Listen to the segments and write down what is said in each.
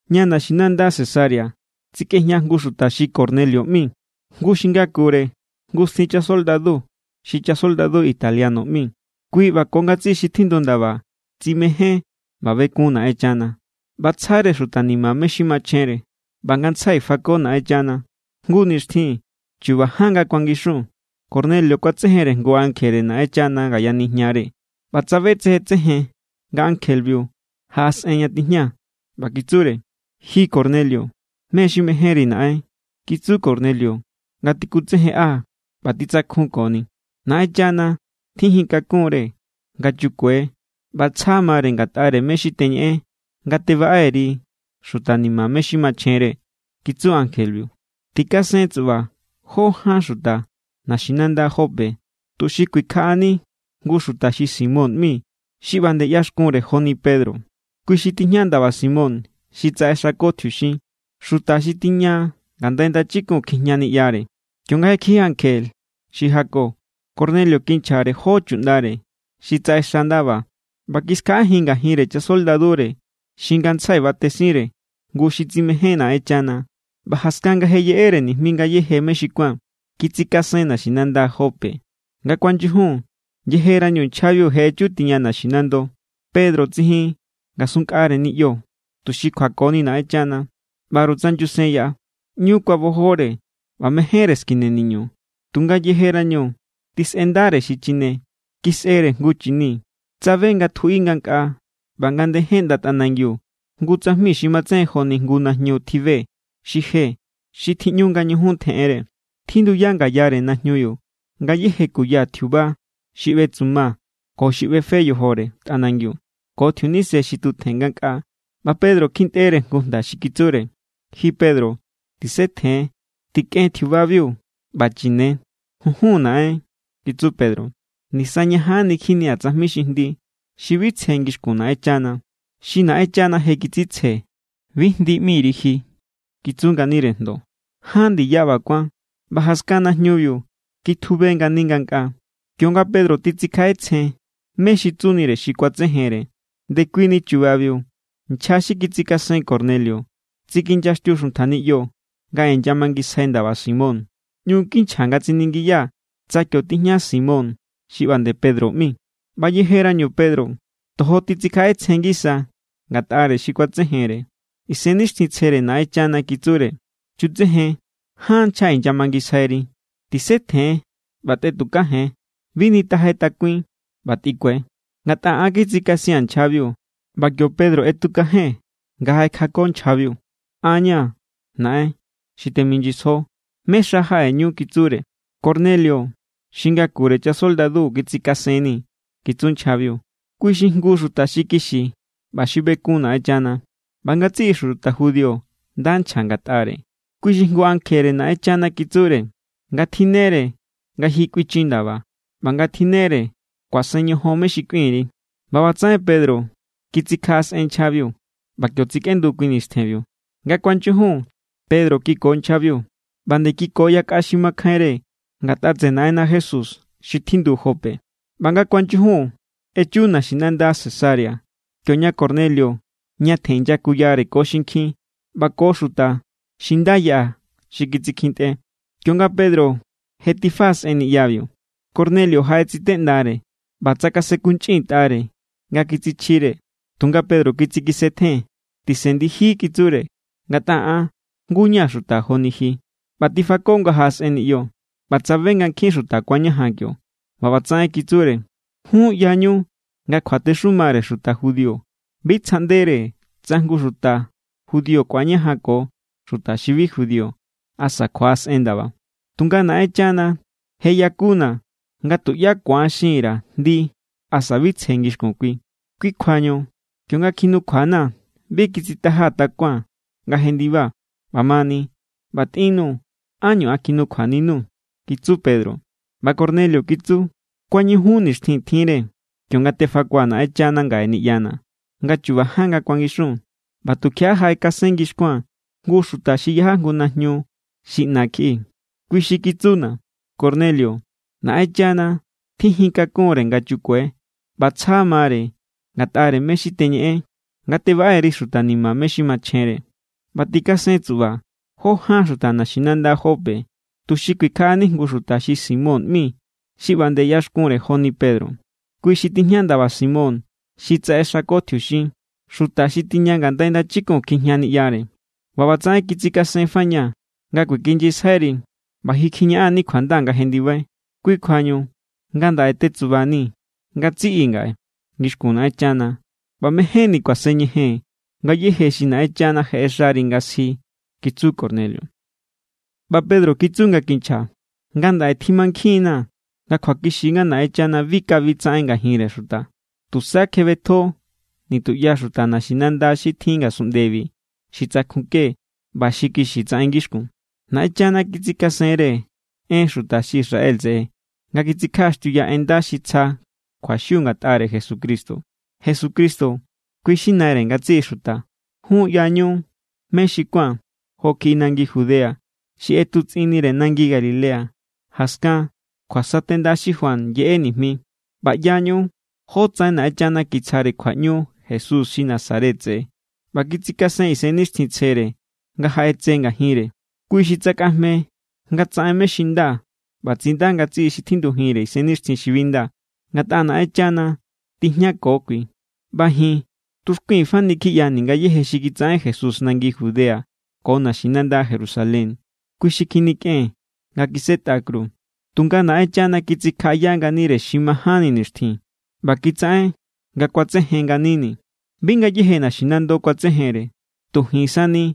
Ña naxinanda Cesarea tsikꞌejña jngu xuta xi Cornelio ꞌmi, jngu xi ngakure jngu stin chasoldadu xi Chasoldadu Italiano ꞌmi. Kui ꞌba ko ngatsiꞌi xi tjindu ndaba tsimején ꞌba bekun Naꞌenchana, ꞌba tsjare xuta ni̱ma̱ mé= xi machjenre, ꞌba ngantsjai fako Naꞌenchana. Jngu nixtjin, chu̱ba̱ ján nga kuangixun, Cornelio kuatsejenre jngu ankjere Naꞌenchana ngaya nijñare. ꞌBa tsabe tsejen tsejen nga ankjebiu jaꞌasꞌen ña tijña. ꞌBa kitsure: —¡Ji Cornelio! —¿Mé= xi mejénri naꞌen? —kitsu Cornelio nga tikutsejenꞌa ꞌba titsakjun koni. —Naꞌenchana tjijintakunre nga chukue ꞌba tsja mare ngatꞌare mé= xi teñeꞌen nga tebaꞌe_ri xuta ni̱ma̱ mé= xi machjenre —kitsu ankjebiu—. Tikasen tsuꞌba jó ján xuta naxinanda Jope tuxi kuikjaꞌani jngu xuta xi Simón ꞌmi xi ꞌba nde ꞌyaxkunre joni Pedro. Kui xi tijña ndaba Simón xi tsaꞌexako tjiuxin, xuta xi tiña ngandai ndachikun kjijña niꞌyare. Kionga je kiji ankje xi jako, Cornelio kinchjare jó chuꞌndare xi tsaꞌexa ndaba ꞌba kiskjaꞌajin ngajinre chasoldadure xi ngantsjai batesinre jngu xi tsimején Naꞌenchana. ꞌBa jaskan nga je yeꞌere nijmi ngayéje mé xi kuán, kitsikasen naxinanda Jope. Nga kuanyujun, yejerañu nchjabiu je echu tiña naxinando, Pedro tsijin ngasun nkꞌare niꞌyo tuxi kjuakoni Naꞌenchana. ꞌBaru tsa nyusen yaꞌa, ꞌñu kuabojore ꞌba mejénre skine niñu. Tunga yejerañu tisꞌendare xi chine, kisꞌere jngu chini. Tsabe nga tjuꞌi ngankꞌaa, ꞌba nga ndejen ꞌnda tꞌanangiu jngu tsajmi xi matsejen joni jngu najñu tjibe xi je xi tjiꞌñu nga ñujun tjeꞌenre. Tjinduya ngayare najñubiu ngayéje kuya tjiuba xi ꞌbetsuma ko xi ꞌbefe yojore tꞌanangiu ko tjiunise xi tutjen ngankꞌaa. ꞌBa Pedro kjintꞌere jngu jnda xi kitsure: —Ji Pedro, tisetjen. Tikꞌen tjiubabiu ꞌba chine. —Junjun Naꞌen —kitsu Pedro—. Nisañajanni kjinia̱ tsajmi xi jndi, xi bi tsje ngixkun Naꞌenchana. —Xi Naꞌenchana je kitsitsje, bi jndi ꞌmiri ji —kitsu nganire jndo. Ján ndiya ꞌba kuán, ꞌba jaskan najñubiu kitjube ngani ngankꞌaa. Kionga Pedro titsikjaꞌetsjen mé= xi tsunire xi kuatsejenre, ndekuini chubabiu nchja xi kitsikasen Cornelio tsikinyaxtiu xuntja niꞌyo nga inyamangisjai ndaba Simón. ꞌÑu kinchja nga tsiningiya tsa kio tijña Simón xi ꞌba nde Pedro ꞌmi. ꞌBa yejerañu Pedro tojo titsikjaꞌetsjen ngisa ngatꞌare xi kuatsejenre, Isennixtjintsjere Naꞌenchana kitsure: —Chutsejen. Ján nchja inyamangisjairi. Tisetjen ꞌba tꞌetukajen. Bi nitajai takuin ꞌba tꞌikue, ngatꞌa an kitsikasia̱n nchjabiu. ꞌBa kio Pedro ꞌetukajen nga jaꞌekjako nchjabiu. —An= ña̱, naꞌen, xi teminyisjo. ¿Mé= xa jaꞌeñu? —kitsure. —Cornelio, xi ngakure chasoldadu, kitsikasenni̱ —kitsu nchjabiu—. Kui xi jngu xuta xi kixi ꞌba xi bekun Naꞌenchana, ꞌba ngatsiꞌi xuta judío nda nchja ngatꞌare. Kui xi jngu ankjere Naꞌenchana kitsure nga tjinnere nga ji kꞌuinchin ndaba, ꞌba nga tjinnere kuasen ñojon mé= xi kꞌuin_ri. ꞌBa ꞌbatsaꞌen Pedro kitsikjaꞌasꞌen nchjabiu, ꞌba kio tsikꞌendu kui nistjenbiu. Nga kuanyujun, Pedro kiko nchjabiu, ꞌba nde kiko yakꞌa xi makjainre ngatꞌa tseꞌe Naꞌenna Jesús xi tjindu Jope. ꞌBa nga kuanyujun echu naxinanda Cesarea, kioña Cornelio ñatjen inyakuyare ko xinkjin ꞌba ko xuta xi nda yaꞌa xi kitsikjintꞌe. Kionga Pedro je tifaꞌasꞌen niꞌyabiu, Cornelio jaꞌetsiteꞌndare ꞌba tsakasenkunchꞌintꞌare nga kitsichjire. Tunga Pedro kitsikisetjen. —Tisen ndiji —kitsure—, ngatꞌa an jngu= ña̱ xuta joni ji. ꞌBa tifako nga jaꞌasꞌen niꞌyo ꞌba tsabe nga nkjin xuta kuañajan kio. ꞌBa ꞌbatsaꞌen kitsure: —Jun ꞌyañu nga kjuatexumare xuta judío bi tsjaꞌndere tsa jngu xuta judío ku̱añajanko xuta xi bi judío asa kjuaꞌasꞌen ndaba. Tunga Naꞌenchana je yakuna̱ nga tuꞌyá ku̱an xin_ra̱ jndi asa bi tsje ngixkun Kui. Kui kjuañu kionga kjinukjuana̱, bi kitsitajaa̱ takuaa̱n nga jendiba. ꞌBamani, ꞌba tꞌinnuu̱, ¿ánñu an kjinukjuaninuu̱? —kitsu Pedro. ꞌBa Cornelio kitsu: —Kuañujun nixtjin tjinre, kionga tefakua̱ Naꞌenchana ngaꞌe niꞌyana̱, nga chu̱ba̱ ján nga kuangixun. ꞌBa tukjiaꞌa jaꞌekasen ngixkuaa̱n jngu xuta xi yaja jngu najñu xi ꞌna kjiꞌi. Kui xi kitsuna̱: “Cornelio, Naꞌenchana tjijintakunre nga chukue ꞌba tsja mare ngatꞌare mé= xi teñeꞌen nga tebaꞌe_ri xuta ni̱ma̱ mé= xi machjenre. ꞌBa tikasen tsuꞌba jó ján xuta naxinanda Jope tuxi kuikjaꞌani jngu xuta xi Simón ꞌmi xi ꞌba nde ꞌyaxkunre joni Pedro. Kui xi tijña ndaba Simón xi tsaꞌexako tjiuxin, xuta xi tiña ngandai ndachikun kjijña niꞌyare.” ꞌBa ꞌbatsaꞌen kitsikasenfañaa̱ nga kuekinyisjairi, ꞌba ji kjiñaꞌan=ni kjuanda nga jendibai. Kui kjuañu ngandaꞌe tetsubani̱ ngatsiꞌi ngaꞌe ngixkun Naꞌenchana, ꞌba mejénni̱ kuaseñejee̱n ngayéje xi Naꞌenchana je ꞌexari nga sji —kitsu Cornelio. ꞌBa Pedro kitsu nga kinchja: —Ngandaꞌe timankjinna̱ nga kjuakixi nga Naꞌenchana bi kabi tsaꞌen ngajinre xuta. Tusa kjebetjo nituꞌya xuta naxinanda xi tjin ngasunꞌndebi xi tsakjunke ꞌba xi kixi tsaꞌen ngixkun. ’Naꞌenchana kitsikasenre en xuta xi Israel tseꞌe nga kitsikjaꞌaxtiuya en nda xi tsja kjuaxiu ngatꞌare Jesucristo. Jesucristo, kui= xi Naire ngatsiꞌi xuta. Jun ꞌyañu mé xi kuán jo kjiꞌi nangi Judea, xi ꞌetutsꞌinnire nangi Galilea jaskan kjuasatenda xi Juan yeꞌe nijmi. ꞌBa ꞌyañu jótsaꞌen Naꞌenchana kitsjare kjuaꞌñu Jesús xi Nazaret tseꞌe ꞌba kitsikasen Isennixtjintsjere nga jaꞌetse ngajinre. Kui xi tsakꞌajme nga tsaꞌen mé= xi nda ꞌba tsinda ngatsiꞌi xi tjindujinre isennixtjin xi bi nda. Ngatꞌa Naꞌenchana tijñako kui. ’ꞌBa ji̱n tuxkui̱n fani kjiꞌyani̱ ngayéje xi kitsaꞌen Jesús nangi Judea ko naxinanda Jerusalén. Kui xi kjinikꞌen nga kisꞌetꞌa kru. Tunga Naꞌenchana kitsikjaꞌaya nganire xi majánni nixtjin ꞌba kitsaꞌen nga ku̱atsejen nganini̱. Bi ngayéje naxinando kuatsejenre, tu ji̱n sani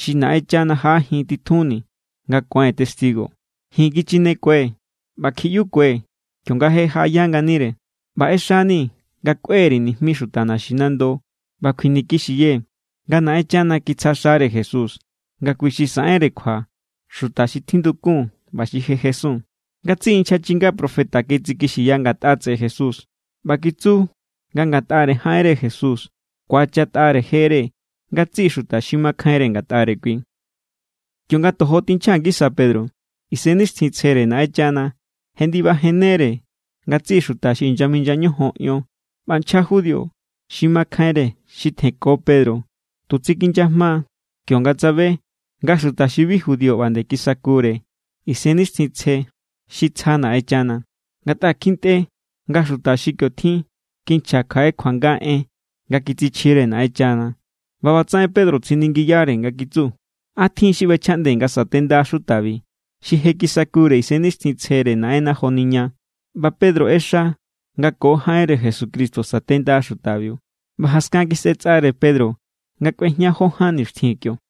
xi Naꞌenchana jaꞌajin titjunni̱ nga kuái̱n testigo. Ji̱n kichinekue̱ ꞌba kjiꞌyukue̱ kionga je jaꞌaya nganire. ꞌBa ꞌexani̱ nga kꞌue_ri̱ nijmi xuta naxinando ꞌba kjuinikixiyee̱ nga Naꞌenchana kitsja xare Jesús nga kui= xi saꞌenre kjua xuta xi tjindukun ꞌba xi je jesun. Ngatsiꞌi nchja chinga profeta kitsikixiya ngatꞌa tseꞌe Jesús ꞌba kitsu nga ngatꞌare jaꞌenre Jesús ku̱achatꞌare jere ngatsiꞌi xuta xi makjainre ngatꞌare kui. Kionga tojo tinchja ngisa Pedro, Isennixtjintsjere Naꞌenchana jendibajennere ngatsiꞌi xuta xi inyaminya ñojon ion. ꞌBa nchja judío xi makjainre xi tjenko Pedro tu tsikinyajma kionga tsabe nga xuta xi bi judío ꞌba nde kisakure Isennixtjintsje xi tsja Naꞌenchana. Ngatꞌa kjintꞌe nga xuta xi kio= tjin kinchja kjaꞌe kuanga en nga kitsichjire Naꞌenchana. ꞌBa ꞌbatsaꞌen Pedro tsiningiyare nga kitsu: —¿A tjin xi ꞌbechjaꞌnde nga satenda xutabi, xi je kisakure Isennixtjintsjere Naꞌenna joni ña? ꞌBa Pedro ꞌexa nga ko jaꞌenre Jesucristo satenda xutabiu. ꞌBa jaskan kisꞌetsꞌare Pedro nga kꞌuejña jó ján nixtjin kio.